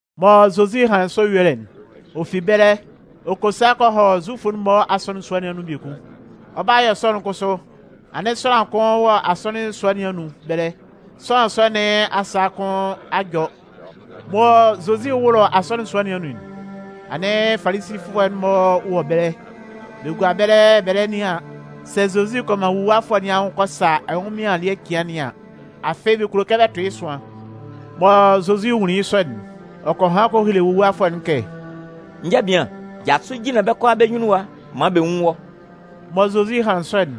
Mɔ Zozi hanlɩn sɔ yuelɩ'n, ɔ fi ɛbɛlɛ ɔ kɔ sa kɔ hɔ Zufʋ'n-mɔ asɔnɩn sua nɩn anun biekun. Ɔ 'ba yɔ sɔ'n kʋsʋ, anɩn sʋanlan kʋn wɔ asɔnɩn sua nɩn anun ɛbɛlɛ. Sʋanlan sɔ nɩn asa kʋn a jɔ. Mɔ Zozi 'wʋlʋ asɔnɩn sua nɩn anun'n, anɩn Falisifʋɛ'n-mɔ wɔ ɛbɛlɛ. Bɛ gua ɛbɛlɛ bɛ lɛ nɩan sɛ Zozi kɔ man wuluwafʋɛ nɩn anwʋn kɔ sa ɛnwʋnmɩan ele cɩan nɩn an. Afɩ bɛ kulo kɛ bɛ tʋn yɩ́ ɛsʋan. Mɔ Zozi nwunlin yɩ́ sɔ'n, ɔ kɔ han kɔ hele wuluwafʋɛ'n kɛ: “Njabian, jasʋ jinlan bɛ́ kʋalaa bɛ́ nyunnun ɛwa maan bɛ nwún wɔ́.” Mɔ Zozi hanlɩn sɔ'n,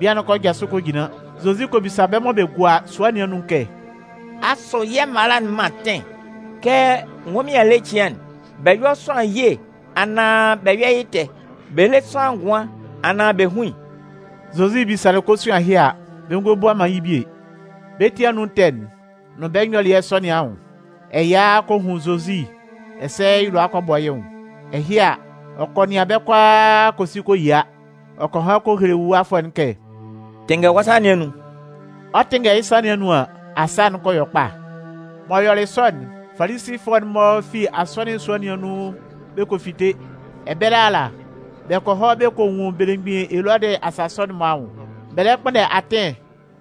bian'n kɔ jasʋ kɔ jinlan. Zozi kɔ bisa bɛ́ mɔ bɛ gua sua nɩn anun'n kɛ: “Asʋ yɛ́ mala'n man atɩn kɛ ɛnwʋnmɩan ele cɩan'n, bɛ yɔ́ sʋanlan ye anaan bɛ yɔ́ yɩ́ ɛtɛ? Bɛ lé sʋanlan ngʋan anaan bɛ hún yɩ́?” Zozi bisalɩ kosuan ɛhɩ a, bɛ ngɔ bua man yɩ́ bie. Bɛ́ ti anun ɛtɛ'n nʋn bɛ nyɔlɩɛ sɔ nɩn anwʋn, ɛya kɔ hun Zozi ɛsɛ yɩ́ lʋa kɔ bɔ yɩ́ nwʋn. Ɛhɩ a, ɔ kɔ nɩan bɛ́ kʋalaa kɔ si kɔ yia. Ɔ kɔ han kɔ hele wuluwafʋɛ'n kɛ: “Tɩnngɛ wɔ́ sa nɩn anun.” Ɔ 'tɩnngɛ yɩ́ sa nɩn anun an, asaa kɔ yɔ kpa. M'ɔ yɔlɩ sɔ'n, Falisifʋɛ'n-mɔ fi asɔnɩn sua nɩn anun bɛ kɔ fite. Ɛbɛlɛ ala, bɛ kɔ hɔ bɛ kɔ nwun belemgbin Elɔdɩ asasʋ'n-mɔ anwʋn. Bɛ lɛ kpʋnndɛ atɩn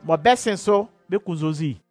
mɔ bɛ 'sɩn sʋ bɛ kun Zozi.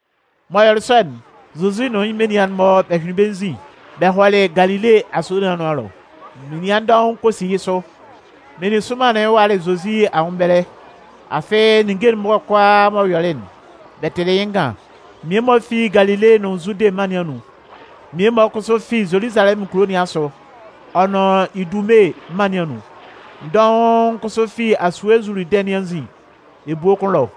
M'ɔ yɔlɩ sɔ'n, Zozi nʋn yɩ́ menian'n-mɔ bɛ hyʋɩnlɩn bɛ́ nzin bɛ hɔlɩ Galile asue nɩn anʋan ɛlɔ. Menian dɔʋn kɔ si yɩ́ sʋ. Meninsʋnman'n walɩ Zozi anwʋn ɛbɛlɛ, afɩ ninnge'n-mɔ kʋalaa m'ɔ yɔlɩ'n, bɛ tɩlɩ yɩ́ ngan. Mmie-mɔ fi Galile nʋn Zude mân nɩn anun. Mmie-mɔ kʋsʋ fi Zoluzalɛmʋn kulo nɩn asʋ ɔ nʋn Idume mân nɩn anun. Dɔʋn kʋsʋ fi asue Zuludɩn nɩn anzin ebue kʋn ɛlɔ.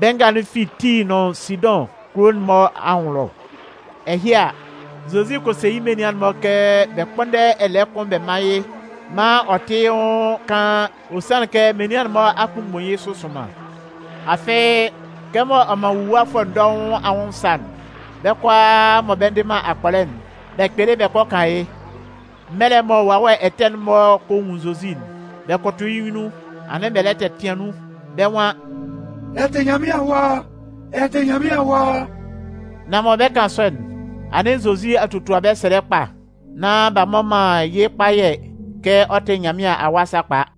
Bɛ́ nga'n fi Tii nʋn Sidʋn kulo'n-mɔ anwʋn ɛlɔ. Ɛhɩ a, Zozi kɔ se yɩ́ menian'n-mɔ kɛ bɛ kpʋ́nndɛ ɛlɛɛ kʋn bɛ mán yɩ́ maan ɔ tɩ́ yɩ́ nwʋn kaan, ɔ sanlɩn kɛ menian'n-mɔ a mgbunmgbun yɩ́ sʋ sʋnman. Afɩ, kɛmɔ ɔ man nwuluwafʋɛ dɔʋn anwʋn sa'n, bɛ́ kʋalaa mɔ bɛ ndɩ man akpɔlɛ'n, bɛ kpɩlɩ bɛ kɔ kan yɩ́. Mɛlɛ mɔ wawɛ ɛtɛ'n-mɔ kɔ nwun Zozi'n, bɛ kʋtʋ yɩ́ nyunnun, anɩn bɛ lɛ tɛtɩan nun. Bɛ́ nwan: “Ɛ tɩ Nyanmɩan Awa! Ɛ tɩ Nyanmɩan Awa!” Nan mɔ bɛ 'kan sɔ'n, anɩn Zozi a totua bɛ́ sɛlɛ kpa nán b'a mmɔ man yɩ́ kpayɛ kɛ ɔ tɩ Nyanmɩan Awa sakpa.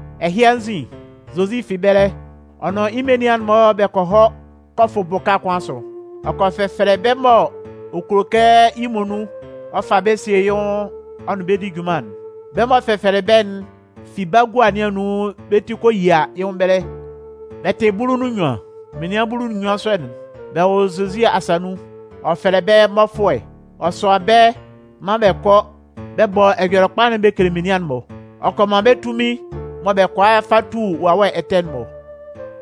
Ɛhɩ anzin, Zozi fi ɛbɛlɛ, ɔ nʋn yɩ́ menian'n-mɔ bɛ kɔ hɔ kɔ fʋ bʋka kʋn asʋ. Ɔ kɔ fɛfɛlɛ bɛ́ mɔ ɔ kulo kɛ yɩ́ muonun ɔ fa bɛ́ sie yɩ́ nwʋn ɔ nʋn bɛ́ di junman'n. Bɛ́ m'ɔ fɛfɛlɛlɩ bɛ́'n fi bagua nɩn anun bɛ́ ti kɔ yia yɩ́ nwʋn ɛbɛlɛ. Bɛ tɩ bulu nʋn nnyuan. Menian bulu nʋn nnyuan sɔ'n, bɛ wɔ Zozi asa nun. [Ɔ fɛlɛ bɛ́ mmɔfʋɛ.] Ɔ sʋan bɛ́ maan bɛ kɔ bɔ Ɛjɔlɛkpa'n bɛ kele menian'n-mɔ. Ɔ kɔ man bɛ́ tunmin mɔ bɛ kʋala fa tu wawɛ ɛtɛ'n-mɔ.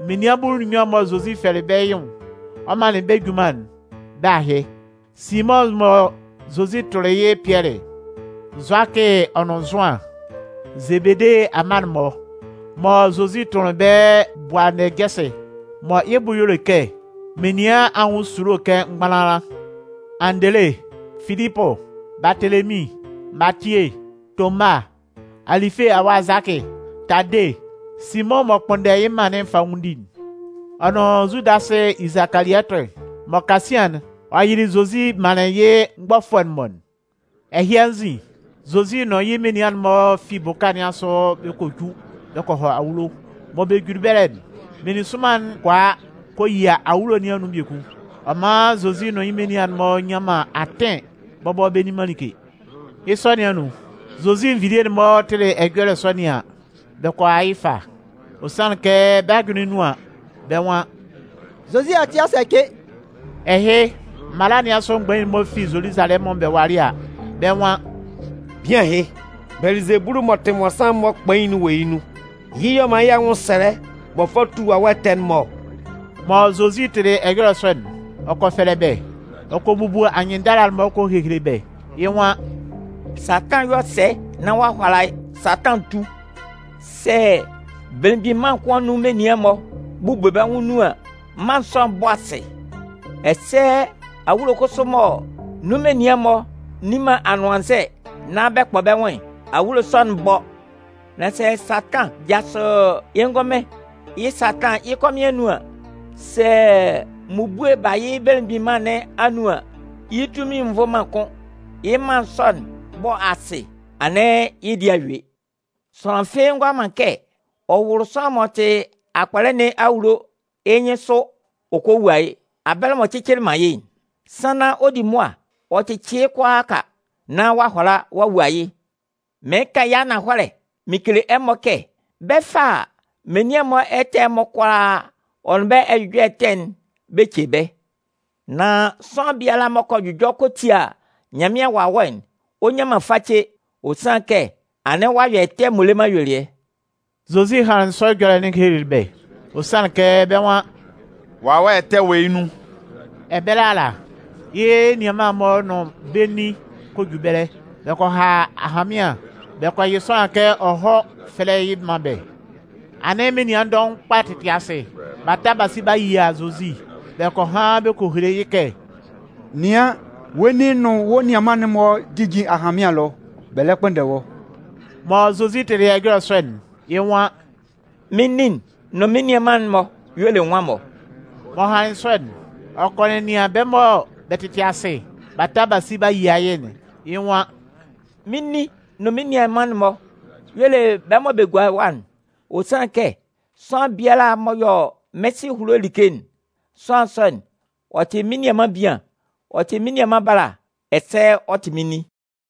Menian bulu nʋn nnyuan'n mɔ Zozi fɛlɛlɩ bɛ́ yɩ́ nwʋn ɔ manlɩn bɛ́ junman'n, bɛ́ ahɩ: Simʋn mɔ Zozi tʋnlɩn yɩ́ Pɩɛlɩ'n, Zʋakɩ ɔ nʋn Zʋan, Zebede amma'n-mɔ (mɔ Zozi tʋnlɩn bɛ́ “Bʋanɛjɛsɩ” mɔ yɩ́ bʋ y'ɔ le kɛ menian anwʋn esulo kɛ mgbanlanlan.) Andele, Filipʋ, Baatelemin, Matie, Toma, Alɩfe awa Zʋakɩ, Tade, Simʋn m'ɔ kpʋnndɛ yɩ́ mân'n fanwʋndi'n, ɔ nʋn Zudasɩ Isikaliɔtɩ mɔ kasian'n, ɔ yɩlɩ Zozi manlɩn yɩ́ mgbɔfʋɛ'n-mɔ'n. Ɛhɩ anzin, Zozi nʋn yɩ́ menian'n-mɔ fi bʋka nɩn asʋ bɛ kɔ ju bɛ kɔ hɔ awulo. Mɔ bɛ juli ɛbɛlɛ'n, meninsʋnman'n kɔ a kɔ yia awulo nɩn anun biekun. Ɔ man Zozi nʋn yɩ́ menian'n-mɔ nnyan man atɩn bɔbɔ bɛ nni man like. Yɩ́ sɔ ɛhɩ anun, Zozi nvilie'n-mɔ tɩlɩ ɛjɔlɛ sɔ nɩn an, bɛ kɔ a yɩ́ ɛfa. Ɔ sanlɩn kɛ bɛ́ ajʋnlɩn nun an, bɛ́ nwan: “Zozi ati a sɛcɩ!” Ɛhɩ, mala nɩn asʋ mgbain'n-mɔ fi Zoluzalɛmʋn bɛ walɩ a, bɛ́ nwan: “Bian ɛhɩ, Bɛlɩzebulu m'ɔ tɩ mmɔnsanmʋn'n-mɔ kpain'n wɔ yɩ́ nun. Yɩ́ y'ɔ man yɩ́ anwʋnsɛlɛ m'ɔ fa tu wawɛ ɛtɛ'n-mɔ ɔ.” Mɔ Zozi tɩlɩ ɛjɔlɛ sɔ'n, ɔ kɔ fɛlɛ bɛ́, ɔ kɔ bubu anyɩnndala-mɔ kɔ hehele bɛ́. Yɩ́ nwan: “Satan 'yɔ sɛ nán ɔ'a hʋala Satan tu? Sɛ belemgbin mân kʋn anun menian'n-mɔ bu bɛ́ nwʋn nun an, mân sɔ'n 'bɔ asɩ. Ɛsɛ awulo kʋn kʋsʋ mɔ nun menian'n-mɔ nni man anʋannzɛ nan bɛ kpɔ bɛ́ nwʋn'n, awulo sɔ'n 'bɔ. Nan sɛ Satan jasʋ yɩ́ ngʋnmɩn yɩ́ Satan yɩ́ kɔmɩn anun an, sɛ mmubue ba yɩ́ belemgbin mân nɩn anun an, yɩ́ tunmin'n nvʋ man kʋ́n. Yɩ́ mân sɔ'n 'bɔ asɩ, anɩn yɩ́ dɩɛ a yue. Sʋanlan fɩ́ɩ́ ngʋala man kɛ ɔ wʋlʋ sʋanlan m'ɔ tɩ akpɔlɛ nɩn awulo yɩ́ nyɩnsʋ ɔ kɔ wua yɩ́, abɛlɛ m'ɔ cɩcɩlɩ man yɩ́'n. Sannan ɔ 'di mʋa ɔ cɩcɩ yɩ́ kʋalaaka nán ɔ'a hʋala ɔ'a wua yɩ́. Mɩɩn kan yɩ́ ananhɔlɛ mɩn kele ɛmɔ kɛ bɛ 'fa menian'n-mɔ ɛtɛ'n-mɔ kʋalaa ɔ nʋn bɛ́ ɛjʋjɔlɛ ɛtɛ'n bɛ ce bɛ́. Nan sʋanlan biala m'ɔ kɔ jʋjɔ kɔ tia Nyanmɩan Wawɛ'n, ɔ nnyan man face. Ɔ sanlɩn kɛ anɩn ɔ'a yɔ ɛtɛ m'ɔ le man ayuelɩɛ.” Zozi hanlɩn sɔ ɛjɔlɛ'n ɔ helelɩ bɛ́, ɔ sanlɩn kɛ bɛ́ nwan: “Wawɛ ɛtɛ wɔ yɩ́ nun.” Ɛbɛlɛ ala, yɩ́ nianman'n-mɔ nʋn bɛ́ nin kɔ ju ɛbɛlɛ. Bɛ kɔ ha ahanmɩan, bɛ kɔ yɩ sʋanlan kɛ ɔ hɔ́ fɛ́lɛ yɩ́ mán bɛ́. Anɩn menian dɔʋn kpa tɩtɩ asɩ, b'a ta b'a si b'a yia Zozi. Bɛ kɔ han bɛ kɔ hele yɩ́ kɛ: “Nɩan, wɔ́ nin nʋn wɔ́ nianman'n-mɔ jijin ahanmɩan ɛlɔ, bɛ lɛ kpʋnndɛ wɔ́.” Mɔ Zozi tɩlɩ ɛjɔlɛ sɔ'n, yɩ́ nwan: “Mɩ́n nin'n nʋn mɩ́n nianman'n-mɔ y'ɔ le nwan-mɔ?” M'ɔ hanlɩn sɔ'n, ɔ kɔ nɛnɩan bɛ́ mɔ bɛ tɩtɩ asɩ b'a ta b'a si b'a yia yɩ́'n, yɩ́ nwan: “Mɩ́n nin nʋn mɩ́n nianman'n-mɔ y'ɔ le bɛ́ mɔ bɛ gua ɛwa'n. Ɔ sanlɩn kɛ sʋanlan biala m'ɔ yɔ mɩ́n Sɩ ehulo like'n, sʋanlan sɔ'n, ɔ tɩ mɩ́n nianman bian, ɔ tɩ mɩ́n nianman bala, ɛsɛ ɔ tɩ mɩ́n nin.”